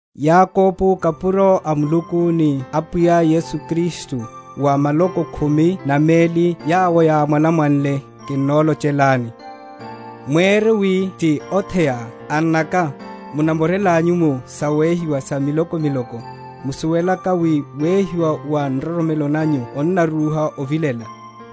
Yakobo, kapuro a Muluku ni a Apwiya Yesu Kristu, wa maloko khumi na meli yawo yámwalamwanle: kinnolochelani. Sa sawehiwa. Mwére wi ti otheya, annaka, munamorelanyu mu sawehiwa sa miloko miloko; musuwelaka wi wehiwa wa nroromelo nanyu onarúha ovilela.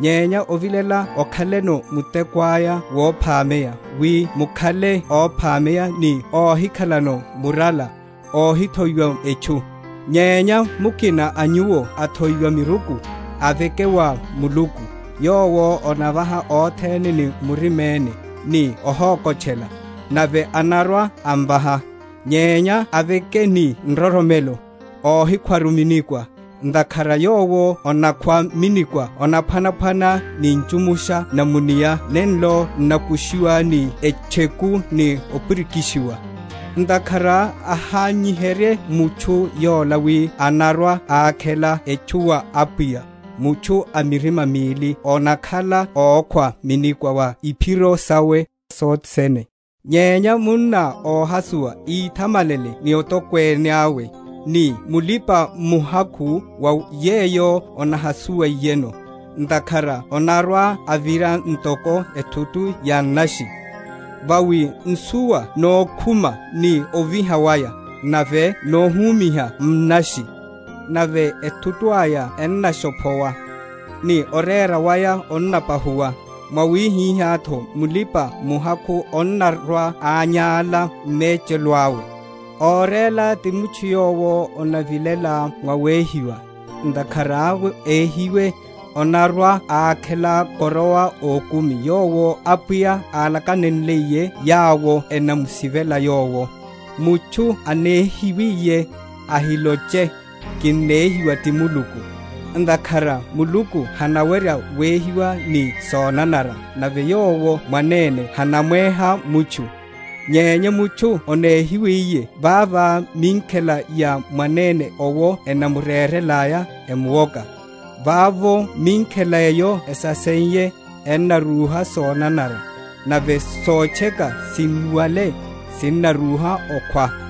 Nyenya ovilela okhaleno muteko aya wophameya, wi mukhale óphameya ni óhikhalano murala, óhithoiwaru etchu. Nyenya mukina a nyuwo athoiwa miruku, aveke wa Muluku, yowo anavaha othene ni muriméne, ni óhókotchela; nave anarwa‐amvaha. Nyenya aveke ni nroromelo, óhikhwaru minikwa; ntakhara yowo onakhwa minikwa onaphwanaphwana ni ntchumusha na mu’nia nenlo n’nakushiwa ni etcheku ni opirikishiwa. Ntakhara ahányiherye mutchu yola wi anarwa‐akhela etchu wa Apwiya; mutchu a mirima mili onakhala ókhwa minikwa va iphiro sawe sothe sene. Nyenya munna óhasuwa íthamalele ni otokwene awe; ni mulipa‐muhakhu va yeyo onahasuwiyeno; ntakhara onarwa‐avira ntoko ethutu ya nnashi. Vawi nsuwa nókhuma ni oviha waya, nave nohumiha nnashi; nave ethutu aya ennashophowa, ni orera wa woneya waya onnapahuwa; mwawihihátho mulipa‐muhakhu onarwa‐anyála m’mechelo awe. Óréla ti mutchu yowo onavilela vawehiwa; ntakhara éhiwe, onarwa‐akhela koroa ókumi, yowo Apwiya álakanenliye yawo enamusivela Yowo. Mutchu onéhiwiye, ahiloche, Kinehiwa ti Muluku; ntakhara Muluku hanawerya wehiwa ni sonanara, nave Yowo mwanene hanamweha mutchu: nyenya mutchu onéhiwa vava minkhela ya mwanene owo enamurérelaya, emuwoka. Vavo minkhela eyo esaseiye, ennarúha sonanara; nave sotcheka, sinnuwale, sinnarúha okhwa.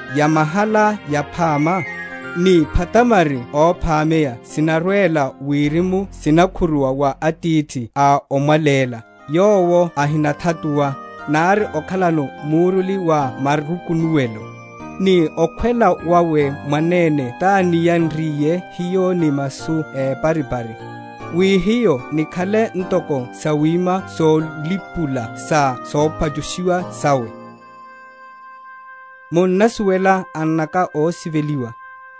Yamahala yaphama, ni phatamari óphameya sinarwela wirimu sinakhuruwa wa Atithi a omwalela, yowo ahinathatuwa, nari okhalano muruli wa marukunuwelo. Ni okhwela wawe mwanene tániyanriye hiyo ni masu éparipari, wi hiyo nikhale ntoko sawima solipula sa sopachushiwa sawe. Nikhale awerano masu. Munnasuwela, annaka ósiveliwa.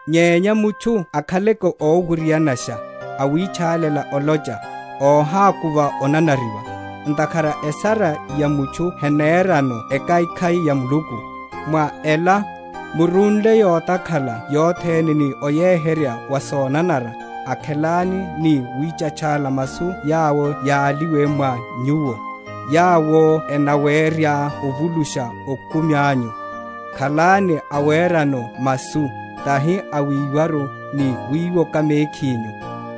Nyenya mutchu akhaleke ówirianasha, awitchálela olocha, óhákuva onanariwa. Ntakhara esara ya mutchu henerano ekhaikhai ya Muluku. Mwa ela, murunle yotakhala yothene ni oyeheryeya wa sonanara, akhelani ni wítchachala masu yawo yáliwe mwa nyuwo, yawo enawerya ovulusha okumi anyu. Khalani awerano masu, tahi awiwaru, ni wiwoka mekhinyu.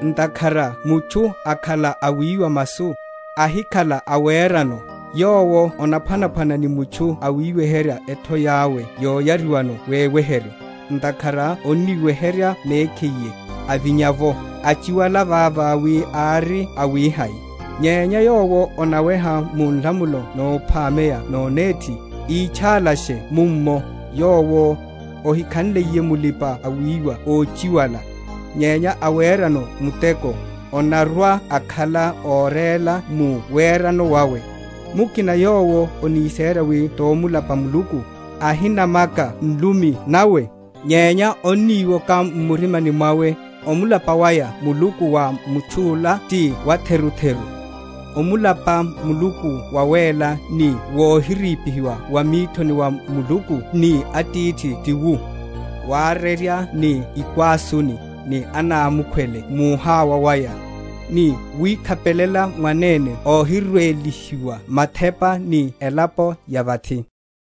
Ntakhara mutchu akhala awiwa masu, ahikhala awerano, yowo onaphwanaphwana ni mutchu awiweherya ethoi awe yoyariwano veweheryo; ntakhara onniweherya mekhiye, avinya’vo, achiwala vavá wi ári awihai. Nyenya yowo onaweha mu nlamulo nophameya nonéthi, ítchálasha mummo, yowo, ohikhanliye mulipa‐wiwa óchiwala, nyenya awerano muteko, onarwa‐akhala óréla mu werano wawe. Mukina yowo oniséra wi tomulapa Muluku, ahinamaka nlumi nawe, nyenya oniwoka m’murimani mwawe, omulapa waya Muluku wa mutchu’la ti watherutheru. Omulapa Muluku wawéla ni wohirípihiwa va mithoni va Muluku ni Atithi ti wu, warerya ni ikwásuni, ni anámukhwele muhawa waya, ni wikhapelela mwanene óhirwelihiwa mathepa ni elapo ya vathi.